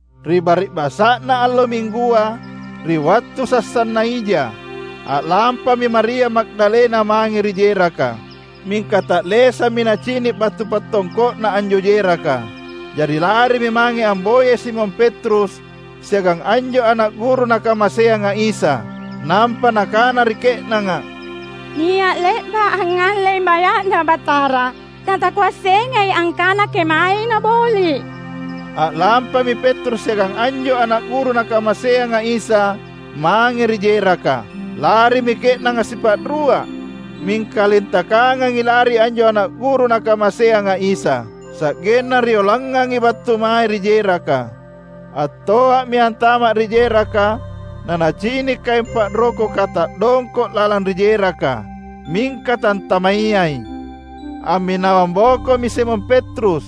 Ri bari’basa’na allo Minggua, ri wattu sassanna ija, a’lampami Maria Magdalena mange ri jeraka. Mingka ta’lesammi nacini’ batu pattongko’na anjo jeraka. Jari larimi mange amboyai Simon Petrus siagang anjo ana’ guru Nakamaseanga Isa, nampa nakana ri ke’nanga, "Nia’ le’ba’ angngallei maya’Na Batara, natakuassengai angkana kemaei naboli’." A’lampami Petrus siagang anjo ana’ guru Nakamaseanga Isa mange ri jeraka. Larimi ke’nanga sipa’rua, mingka lintakangangi lari anjo ana’ guru Nakamaseanga Isa. Sa’genna rioloangangi battu mae ri jeraka. Attoa’mi antama’ ri jeraka nanacini’ kaeng pa’rokoka ta’dongko’ lalang ri jeraka; mingka tantamayai. Amminawang bokomi Simon Petrus;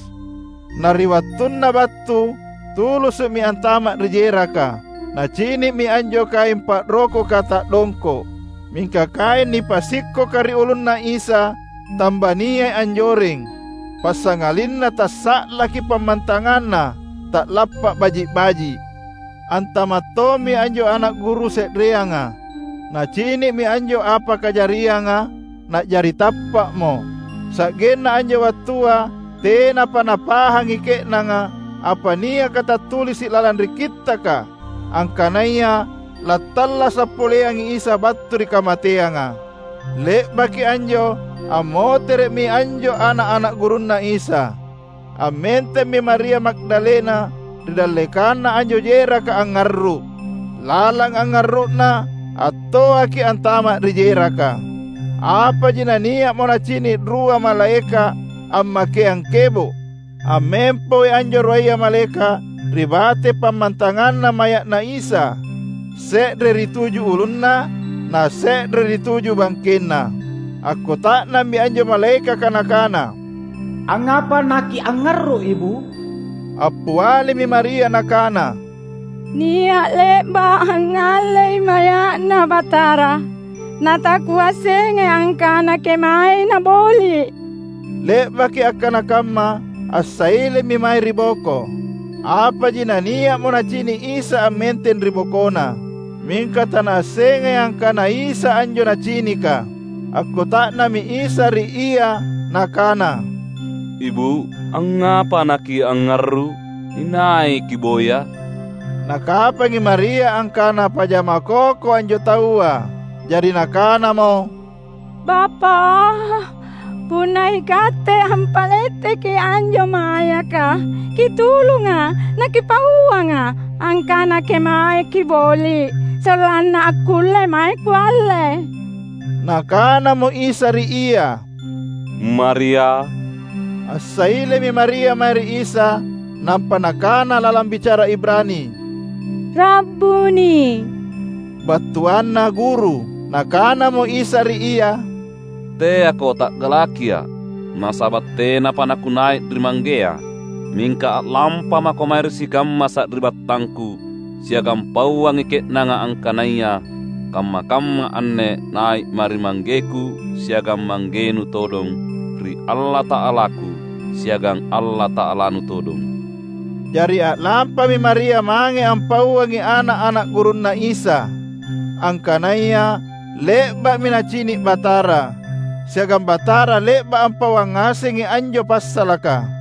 na ri wattunna battu, tulusu’mi antama’ ri jeraka. Nacini’mi anjo kaeng pa’rokoka ta’dongko’. Mingka kaeng nipasikkoka ri ulunNa Isa tambaniai anjoreng passangalinna tassa’laki pammantanganna, ta’lappa’ baji’-baji’. Antama’ tommi anjo ana’ guru se’reanga. Nacini’mi anjo apa kajarianga, na’jari tappa’mo. (Sa’genna anjo wattua tenapa napahangi ke’nanga apa niakatattulisi’ lalang ri Kittaka angkanaya lattallasa’ poleangi Isa battu ri kamateanga.) Le’baki anjo ammotere’mi anjo ana’-ana’ gurunNa Isa. Ammentemmi Maria Magdalena ri dallekanna anjo jeraka angngarru’. Lalang angngarru’na, attoaki antama’ ri jeraka. Apaji nania’mo nacini’ rua malaeka’ ammakeang kebo’. Ammempoi anjo ruaya malaeka’ ri bate pammantanganna maya’Na Isa, se’re ri tuju ulunNa, nase’re ri tuju bangkenNa. Akkuta’nammi anjo malaekaka nakana, "Angngapa nakiangngarru’ ibu’?" Appialimi Maria nakana, "Nia’ le’ba’ angngallei maya’Na Batara, natakuassengai angkana kemae naboli’." Le’baki akkana kamma, assailemi mae ri boko. Apaji nania’mo nacini’ Isa ammenteng ri bokona. Mingka tanaassengai angkana Isa anjo nacinika. Akkuta’nammi Isa ri ia Nakana, "Ibu’, angngapa nakiangngarru’? Inai kiboya?" Nakapangi Maria angkana pajama koko anjo taua. Jari nakanamo, "Bapa’, punna ikatte ampaletteki anjo mayaka, kitulunga’ nakipauanga’ angkana kemae kiboli’, sollanna akkulle mae kualle." Nakanamo Isa ri ia, "Maria!" Assailemi Maria mae ri Isa, nampa nakana lalang bicara Ibrani, "Rabbuni!" (Battuanna "Guru".) Nakanamo Isa ri ia, "Teako ta’galakiA’, nasaba’ tenapa naKunai’ ri Manggea. Mingka a’lampamako mae ri sikamma sari’battangKu, siagang pauangi ke’nanga angkanaya kamma-kamma anne nai’Ma’ ri ManggeKu siagang Manggenu todong, ri Allata’alaku siagang Allata’alanu todong." Jari a’lampami Maria mange ampauangi ana’-ana’ gurunNa Isa, angkanaya le’ba’mi nacini’ Batara, siagang Batara le’ba’ ampauang ngasengi anjo passalaka.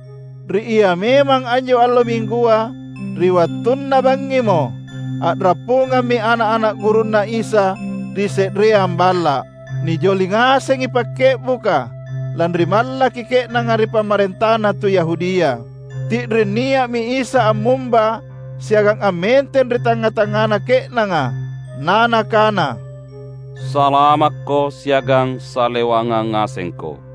Ri ia memang anjo allo Minggua, ri wattunna bangngimo, a’rappungammi ana’-ana’ gurunNa Isa ri se’reang balla’. Nijoli ngasengi pakke’buka, lanri mallaki ke’nanga ri pamarentana tu Yahudia. Ti’ring nia’mi Isa ammumba, siagang ammenteng ri tangnga-tangngana ke’nanga, na Nakana, "Salamakko siagang salewangang ngasengko."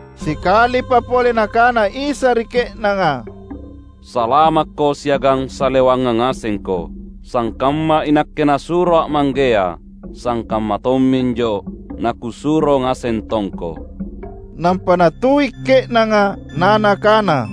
Sikalipa pole Nakana Isa ri ke’nanga, "Salamakko siagang salewangang ngasengko. Sangkamma iNakke NasuroA’ Manggea, sangkamma tomminjo naKusuro ngaseng tongko." Nampa Natui’ ke’nanga na Nakana,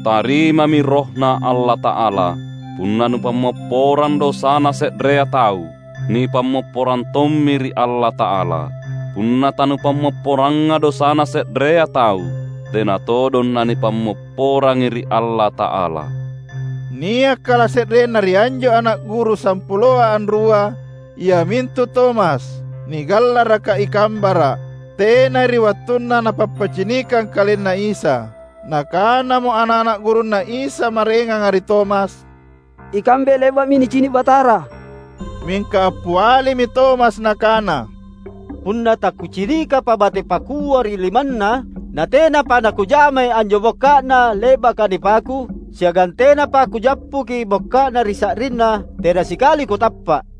"Tarimami RohNa Allata’ala. Punna nupammopporang dosana se’rea tau, nipammopporang tommi ri Allata’ala. Punna tanupammopporanga dosana se’rea tau tena todong nanipammopporangi ri Allata’ala." Nia’ kalase’renna ri anjo ana’ guru sampuloa anrua, iamintu Tomas, (nigallaraka i "Kambara’"), tenai ri wattunna Napappicinikang KalenNa Isa. Nakanamo ana’-ana’ gurunNa Isa maraenganga ri Tomas, "Ikambe le’ba’mi nicini’ Batara!" Mingka appialimi Tomas nakana, "Punna takucinikapa bate pakua ri limanNa, natenapa nakujamai anjo bokka’Na le’baka nipaku, siagang tenapa kujappuki bokka’Na ri sa’rinNa, tena sikali kutappa’."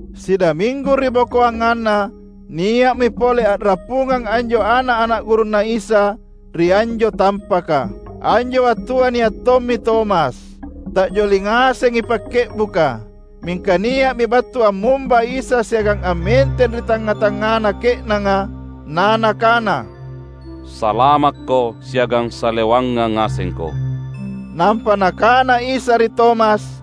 Sidaminggu ribokoanganna, nia’mi pole a’rappungang anjo ana’-ana’ gurunNa Isa ri anjo tampaka. Anjo wattua nia’ tommi Tomas. Ta’joli ngasengi pakke’buka. Mingka nia’mi battu ammumba Isa siagang ammenteng ri tangnga-tangngana ke’nanga, na Nakana, "Salamakko siagang salewangang ngasengko." Nampa Nakana Isa ri Tomas,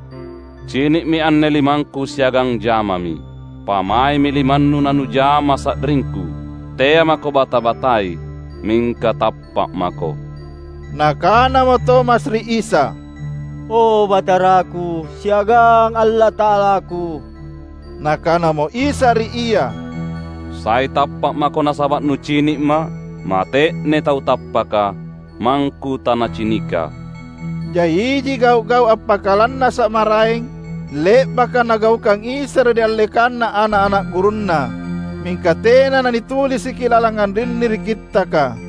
"Cini’mi anne limangKu siagang jamami. Pamaemi limannu nanujama sa’ringKu. Tea’ mako bata-batai, mingka tappa’ mako!" Nakanamo Tomas ri Isa, "O Bataraku, siagang Allata’alaku!" Nakanamo Isa ri ia, "Sai tappa’ mako nasaba’ nucini’Ma’? Mate’nei tau tappaka, mangKu tanaciniKa!" Jai iji gau’-gau’ appakalannasa’ maraeng, le’baka Nagaukang Isa ri dallekanna ana’-ana’ gurunNa. Mingka tena nanitulisiki lalang anrinni ri kittaka.